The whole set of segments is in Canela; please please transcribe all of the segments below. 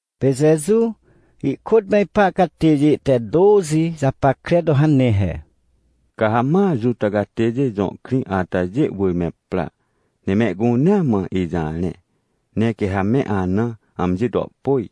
Pê Jeju ihkôt me ipa catêjê te tôxi japackre to hane he: — Ca ha ma Juta catêjê jõ krĩ atajê wỳr me pra, ne mehcunea mã ijarẽ. Ne quê ha me ana amji to pôj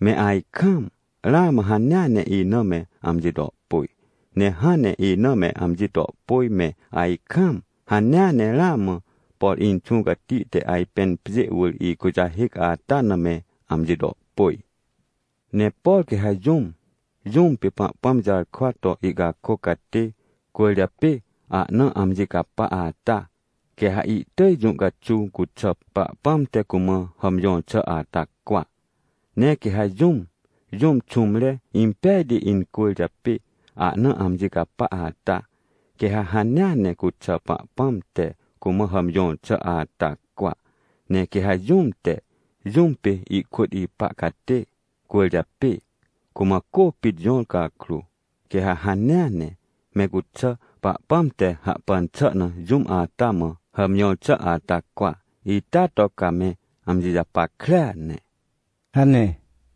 me ajkaam, ramã hanea ne ina me amji to pôj. Ne hãn ne ina me amji to pôj me ajkaam, hanea ne ramã, por Inxũ Cati te ajpên pjê wỳr ikujahêc ata na me amji to pôj. — Ne por quê ha jũm, jũm pê Pahpãm jarkwa to ihcakôc catê cwỳrjapê ahna amji capa ata, quê ha ihtỳj jũ caxuw cuxà, Pahpãm te cumã hàmjõr xà ata cwa. Ne quê ha jũm, jũm xũmre impejti incwỳrjapê ahna amji capa ata, quê ha hanea ne cuxà, Pahpãm te cumã hàmjõr xà ata cwa. Ne quê ha jũm te, jũm pê ikôt ipa catê cwỳrjapê, cumã cô pit jõr cakrô, quê ha hanea ne, me cuxà, Pahpãm te hahpan xà na jũm ata mã hàmjõr xà ata cwa. Ita to ca me amji japackrea ne — hane.